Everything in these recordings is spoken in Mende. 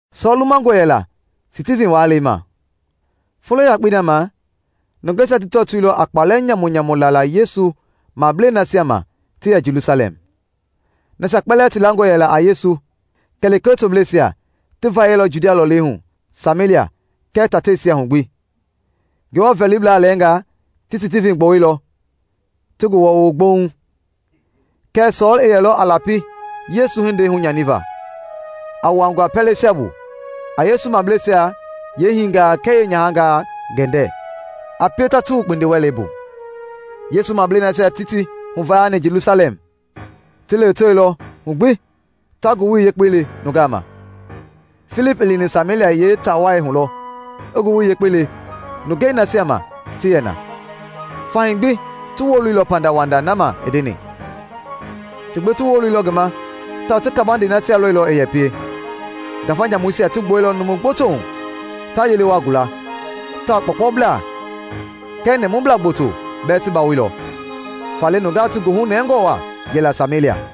Sɔɔl lumangɔ yɛla Stivin waalɛi ma. Folo yakpei na ma, nungeisia ti tɔtoilɔ a kpalɛ nyamunyamu lala Yesu mableisia nasia ma ti yɛ Jelusalɛm. Nasia kpɛlɛɛ ti langɔ yɛla a Yesu, kɛ lekee tobleisia, ti vayɛilɔ Judia lɔlei hu Samelia kɛɛ tateisia hu gbi. Ngewɔ vɛliblaa lɛɛngaa ti Stivin gbɔwuilɔ, ti ngi wɔɔwo gbouŋ. Kɛɛ Sɔɔl i yɛlɔ a lapi Yesu hindei hunyaniva, a wuangua pɛleisia bu, a Yesu mableisia yeehinga kɛɛ yeenyahangaa gɛndɛ, a pie ta ti wu kpindiwɛlei bu. Yesu mablei nasia ti ti huvayani Jelusalɛm ti lewetewelɔ hu gbi ta Ngowili Yepkei le nungaa ma. Filip i lini Samelia yeetaa wai hu lɔ i Ngowili Yekpei le nungei nasia ma ti yɛ na. Fahii gbi ti woloilɔ pandawanda na ma i ndeni. Ti gbi ti woloilɔ ngi ma tawao ti kabande hindei nasia lɔilɔ i yɛ pie. Ngafa nyamuisia ti gbuɛilɔ numu gboto hu ta yele waa gula; tawao kpɔɔkpɔblaa kɛɛ nɛmublaa gboto bɛɛ ti bawoilɔ. Faale nungaa ti goohu nɛngɔ waa yɛla Samelia.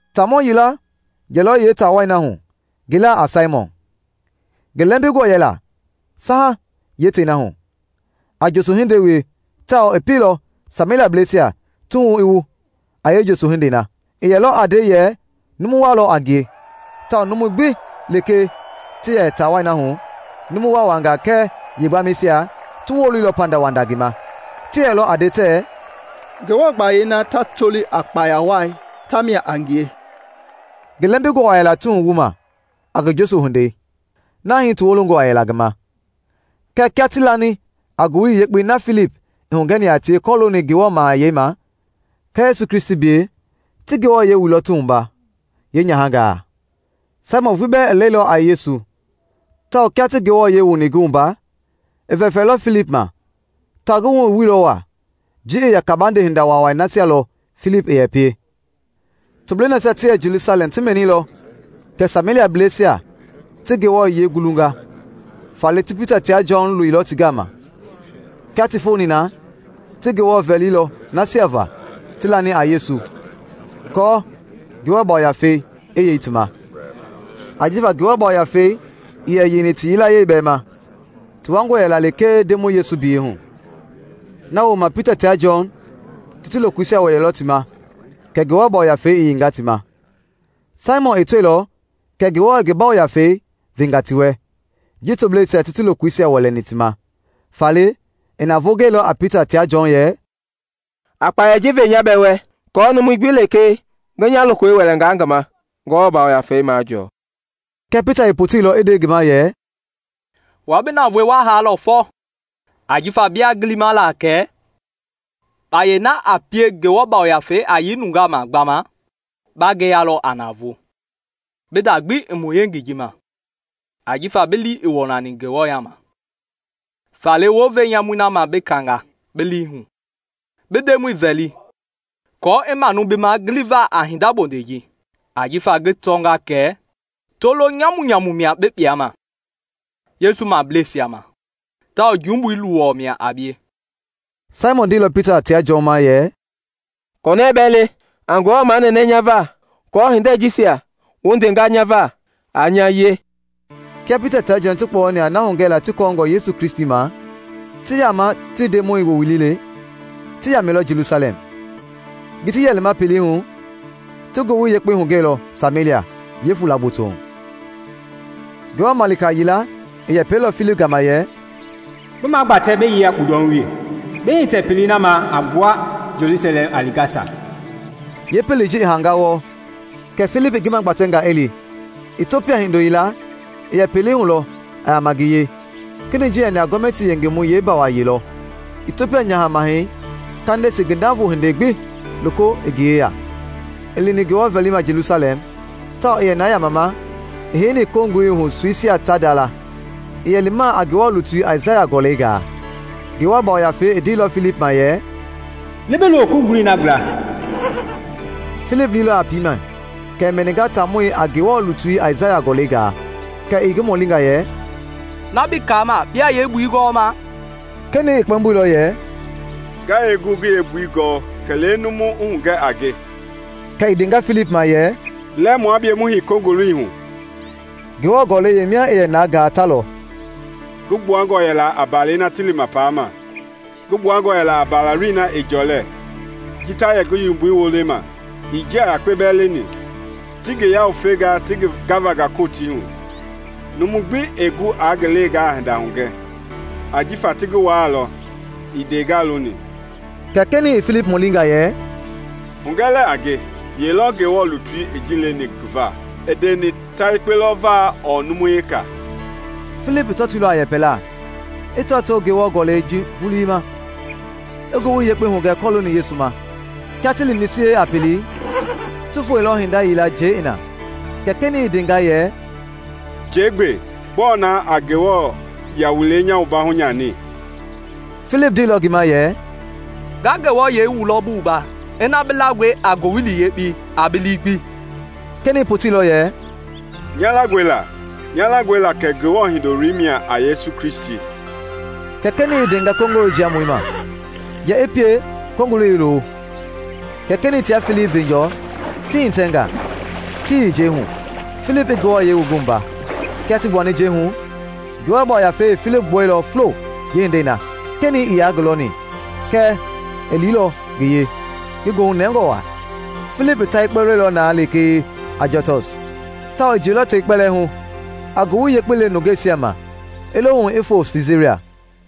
Taamɔ yila yɛlɔ yeetaa wai na hu ngi laa a Saimɔn. Ngi lɛmbingɔ yɛla saha yeetei na hu, a njoso hindei wie tawao i pielɔ Sameliablɛisia ti wuhu i wu a yeenjoso hindei na. I yɛlɔ a nde yɛ numu waa lɔ a ngie, tawao numui gbi lekee ti yɛ taa wai na hu, numu waawangaa kɛɛ yeegbamɛisia, ti woloilɔ pandawanda ngi ma. Ti yɛlɔ a nde tɛɛ, “Ngewɔ gbayei na ta toli a ‘Kpaya Wai’ tamia a ngie.” Ngi lɛmbingɔ waa yɛla ti wuhu wuma a ngi yoso hindei, na hii ti wolongɔ waa yɛla ngi ma. Kɛɛ kia ti lani a Ngowili Yekpei na Filip i hugɛni a tie kɔlooni Ngewɔ Mahayɛi ma kɛɛ Yesu Kristi biyɛi, ti ti wuɛilɔ, yeenyahangaa. Saimɔn vulii bɛɛ i lɛilɔ a Yesu tawao kia ti ngi wuani, i vɛfɛilɔ Filip ma tawao ngi wuhu i wuilɔ waa ji i yɛ kabande hinda waawai nasia lɔ Filip i yɛ pie. Toblei nasia ti yɛ Jelusalɛm ti mɛnilɔ kɛ Sameliablɛisia ti Ngewɔ yiɛi gulunga; faale ti Pita tia Jɔn loilɔ ti gama. Kia ti foni na ti Ngewɔ vɛlilɔ nasia va ti lani a Yesu aako Ngewɔ Yafei i yei ti ma. Ajifa Ngewɔ Yafei ii yɛ yeini ti yilayee bɛɛ ma; ti wuangɔ yɛla lekee Ndemɔi Yesu biyɛi hu. Na wooma Pita tia Jɔn ti ti lokoisia wɛleilɔ ti ma kɛ Ngewɔ Yafei i yeinga ti ma. Saimɔn i tɔilɔ kɛ Ngewɔ i ngi Yafei venga ti wɛ ji tobleisia ti ti lokoisia wɛlɛni ti ma. Faale i navoo gɛilɔ a Pita tia Jɔn yɛ, “A kpayei ji ve nya bɛɛ wɛ aako numu gbi lekee ngi nya lokoi wɛlɛngaa ngi ma i Ngewɔ Yafei majɔɔ.” Kɛɛ Pita i poteilɔ i nde ngi ma yɛ, “Wua bi navoei wa haalɔ fɔ, ajifa biaa gilima kɛ kpayei na a pie Ngewɔ Yafei a yei nungaa ma gbama ba ngeyalɔ a navoo! Bi nda gbi ii mu yengei ji ma, ajifa bi lii ii wɔnani Ngewɔ yaama. Faale wounve nyamui na ma bi kaanga bi lii hu, bi Ndemɔi vɛli aako i manu bi ma giliva a hinda bondei ji. Ajifa ngi tɔnga kɛ tolo nyamunyamu mia bi kpuama Yesu mableisia ma tawao jumbui luwɔ mia a bie.” Saimɔn ndeilɔ Pita tia Jɔn ma yɛ, “Konɛɛ bɛɛ le, a Ngewɔ manɛnɛ nya va aako hindei jisia wu ndenga nya va aa nya wie.” Kia Pita tia Jɔn ti kpɔyɔni a na hugɛla ti kɔɔngɔ kɔlooni Yesu Kristi ma, ti yaama ti Ndemɔi Woowili le, ti yamɛilɔ Jelusalɛm. Ji ti yɛ lima pelei hu ti Ngowili Yekpei hugɛilɔ Samelia yeefula gboto hu. Ngewɔ malika yila i yɛpɛilɔ Filip gama yɛ, “Bi magbatɛ bi yei a kpundɔhu wee, bi hitɛ pelei na ma a gbua Jelusalɛm a li Gasa.” (Yeepelei ji i haanga wɔɔ.) Kɛ Filip i ngi magbatɛnga i li. Itiopia hindo yila i yɛ pelei hu lɔ a yaama ngi yee. Kenɛi ji yɛni a gɔmɛtii yengemɔi yeebaamayee lɔ, Itiopia Nyaha Mahɛi Kandesi ngi navoo hindei gbi loko i ngi yeya. I lini Ngewɔ vɛlima Jelusalɛm, tawao i yɛ na yamama, i heini kongoloi hu soisia ta ndala. I yɛ limaa a Ngewɔ lutui Aisaya gɔlɛi gaa. Ngewɔ Yafei i ndeilɔ Filip ma yɛ, “Li bi lo kongoloi na gbla.” Filip liilɔ a piimɛ kɛ i mɛninga taamɔi a Ngewɔ lutui Aisaya gɔlɛi gaa; kɛ i ngi mɔlinga yɛ, “Na bi kaama biaa yeembui gɔɔma?” Kenɛi i kpɛmboilɔ yɛ, “Nga yee gu ngi yeembui gɔ, kɛ numu i hugɛ a nge?” Kɛ i ndenga Filip ma yɛ, “Lɛ mua bie mu hei kongoloi hu.” Ngewɔ gɔlɛi yeemia i yɛ na gaa ta lɔ: “Ngi gbuangɔ yɛla a mbalɛi na ti lima paama; ngi gbuangɔ yɛla a mbalaloi na ɛɛ jɔlɛ ji ta yɛ ngi yomboi wolema; ii njia yakpe bɛɛ leni. Ti ngi yawufenga ti ngi gavanga Kotii hu. Numu gbi ɛɛ gu aa ngi leengaa hinda hugɛ, ajifa ti ngi waalɔ, ii ndeengaa loni.” Kɛ kenɛi i Filip mɔlinga yɛ, “Hugɛ lɛɛ a nge, ye lɔ Ngewɔ lutui i ji leni ngi va? I ndeni ta yekpe lɔ va ɔɔ numu weka?” Filip tɔtoilɔ a yɛpɛlaa, i tɔtoo Ngewɔ gɔlɛi ji vulii ma, i Ngowili Yekpei hugɛ kɔlooni Yesu ma. Kia ti lini sie a pelei, ti foeilɔ hinda yila njɛi i na, kɛ kenɛi i ndenga yɛ, “Njɛi gbe. Gbɔɔ na a nya wualei hunyani?” [ Filip ndeilɔ ngi ma yɛ, “Nga bi wualɔ ina bi langɔe a Ngowili Yekpei a bi lii gbi.” Kenɛi poteilɔ yɛ, “Nya langɔe la, nya langɔe la kɛ Ngewɔ Hindoloi mia a Yesu Kristi”] Kɛ kenɛi i ndenga kongolo jiamɔi ma yɛ i pie kongoloi i lo; kɛ kenɛi tia Filip veenjɔɔ ti hitɛnga ti yei njɛi hu, Filip i ngi wua. Kia ti gbuani njɛi hu, Ngewɔ Yafei i Filip gbuɛilɔ fulo yeehindei na. Kenɛi ii yaa ngi lɔni kɛɛ i liilɔ ngi yee ngi goohu nɛngɔ waa. Filip i ta yekpe lɔilɔ na lekee Ajotɔs tawao i jiɛilɔ tei kpɛlɛɛ hu a Ngowili Yekpei le nungeisia ma i lo hu i foo Siisaria.